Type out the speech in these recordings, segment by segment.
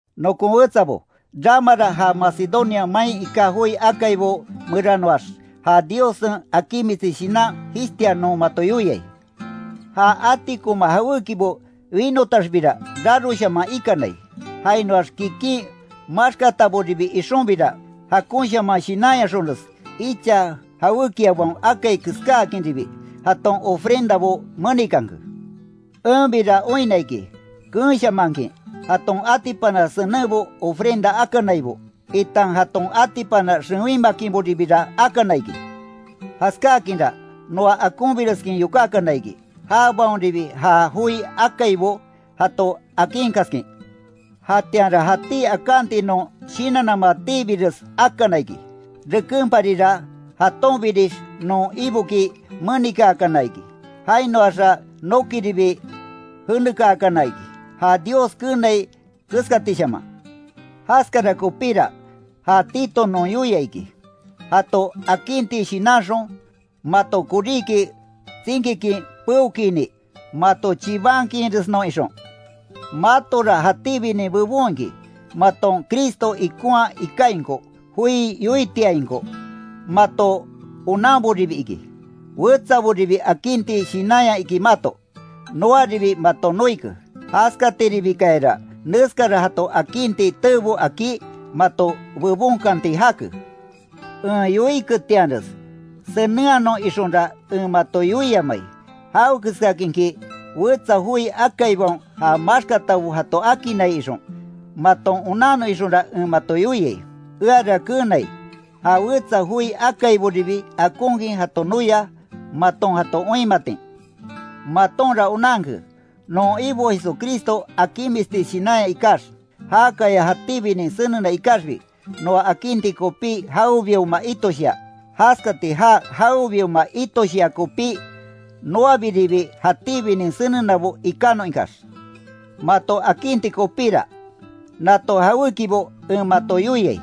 Nokon wetsabo, ramara ja Macedonia main iká joi akaibo meranoax, ja Diossen akinmisti shinan jishtia non mato yoiai. Ja atikonma jawékibo winotaxbira, raroshaman ikanai. Jainoax kikin maxkataboribi ixonbira, jakonshaman shinanyaxonres, icha jawékiabaon akai keskáakinribi jaton ofrendabo menikanke. Enbira oinna iki, keenshamankin, jaton atipana senenbo ofrenda akanaibo, itan jaton atipana xewinmakinboribira akana iki. Jaskákinra, noa akonbireskin yokákana iki, jabaonribi ja joi akaibo jato akinkaskin. Jatianra jatí akanti non shinannamatiibires akana iki. Rekenparira, jatonbinix non Iboki menikaakana iki, jainoaxa nokiribi jenekaakana iki, ja Dios keenai keskatishaman. Jaskara kopíra, ja Tito non yoia iki, jato akinti shinanxon, mato koríki tsinkikin peokinni, mato chibankiinresnon ixon. Matora jatíbinin bebon iki: Maton Cristo ikonhaa ikainko; joi yoitiainko; mato onanboribi iki; wetsaboribi akinti shinanya iki mato; noaribi maton noike. Jaskatiribikayara, neskara jato akinti teebo akí, mato bebonkanti jake. En yoiketianres senenhanon ixonra en mato yoiamai; jawekeskakinki wetsa joi akaibaon ja maxkatabo jato akinnai ixon, maton onannon ixonra en mato yoiai. Eara keenai, ja wetsa joi akaiboribi akonkin jato noia, maton jato oinmatin. Matonra onanke, non Ibo Jesucristo akinmisti shinanya ikax, jákaya jatíbinin senena ikaxbi, noa akinti kopí jawebioma itoshia. Jaskati já jawebioma itoshia kopí, noabiribi jatíbinin senenabo ikanon ikax. Mato akinti kopíra, nato jawékibo en mato yoiai.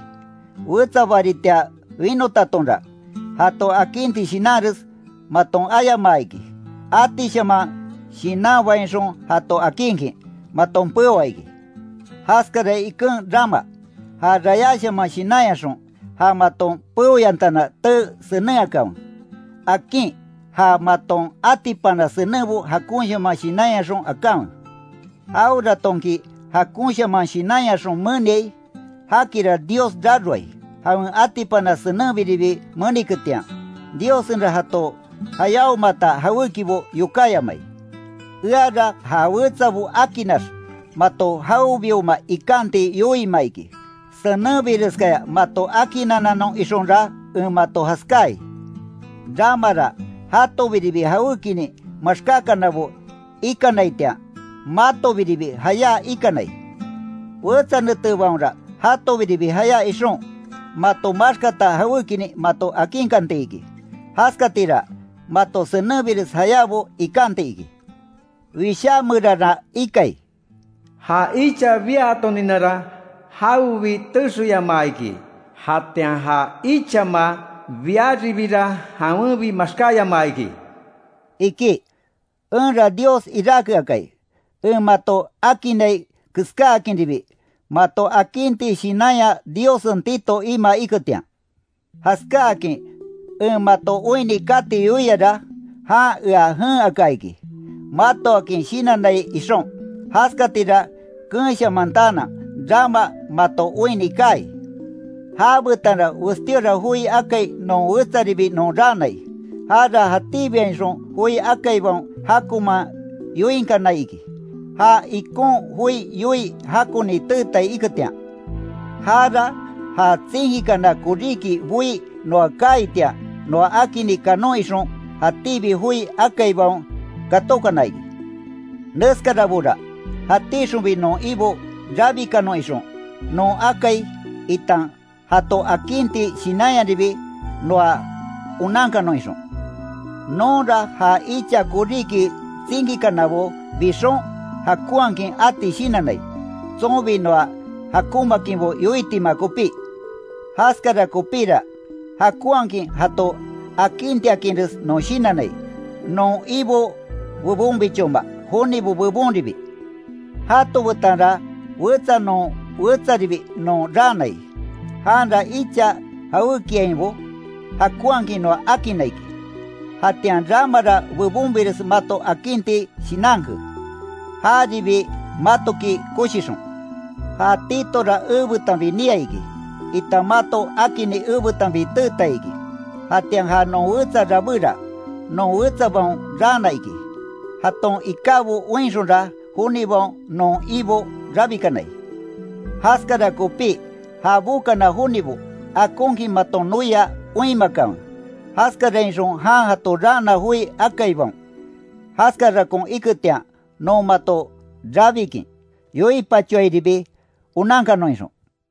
Wetsa baritia winotatonra, jato akinti shinanres, maton ayamaa iki, atishaman shinanbainxon jato akinkin, maton peoa iki. Jaskara iken rama, ja rayáshaman shinanyaxon, ja maton peoyantana tee senenhakanwe. Akin, ja maton atipana senenbo jakonshaman shinanyaxon akanwe. Jaweratonki jakonshaman shinanyaxon meniai, jakira Dios raroai, jawen atipana senenbiribi meniketian, Diossenra jato jayáomata jawékibo yokáyamai. Eara ja wetsabo akinnax, mato jawebioma ikanti yoiima iki. Senenbireskaya mato akinnananon ixonra en mato jaskai. Ramara jatobiribi jawékinin maxkákanabo ikanaitian, matobiribi jayá ikanai, wetsa netebaonra jatobiribi jayá ixon, mato maxkata jawékinin mato akinkanti iki, jaskatira, mato senenbires jayábo ikanti iki. Wishá meranra ikai: “Ja icha biatoninara, jawebi texeyamaa iki, jatian ja ichama biaribira jawenbi maxkáyamaa iki”, iki. Enra Dios iráke akai, en mato akinnai keskáakinribi, mato akinti shinanya Diossen Tito imaa iketian. Jaskáakin en mato oinni kati yoiara, jan ea jen aka iki, matoakin shinannai ixon, jaskatira keenshamantaanan, rama mato oinni kaai. Já betanra westíora joi akai non wetsaribi non raanai, jara jatíbiainxon joi akaibaon jakonman yoinkanai iki, ja ikon joi yoii jakoni teetai iketian. Jara ja tsinkikana koríki boí noa kaaitian noa akini kanon ixon, jatíbi joi akaibaon katókana iki. Neskarabora, jatíxonbi non Ibo rabikanon ixon, non akai, itan jato akinti shinanyaribi noa onankanon ixon. Nonra ja icha koríki tsinkikanabo bixon, jakonhakin ati shinannai, tsonbi noa jakonmaakinbo yoitima kopí. Jaskara kopíra, jakonhakin jato akintiakinres non shinannai, non Ibo bebonbichoma, jonibo bebonribi. Jato betanra, wetsa non wetsaribi non raanai, janra icha jawékiainbo, jakonhakin noa akinna iki; jatian ramara bebonbires mato akinti shinanke, jaribi matoki koshixon. Ja Titora ebetanbi niai iki, itan mato akinni ebetanbi teetai iki. Jatian ja non wetsa rabéra, non wetsabaon raana iki. Jaton ikábo oinxonra, jonibaon non Ibo rabikanai. Jaskara kopí, ja bokana jonibo, akonkin maton noia oinmakanwe, jaskarainxon jan jato raana joi akaibaon, jaskarakon iketian, non mato rabikin yoipachoairibi, onankanon ixon.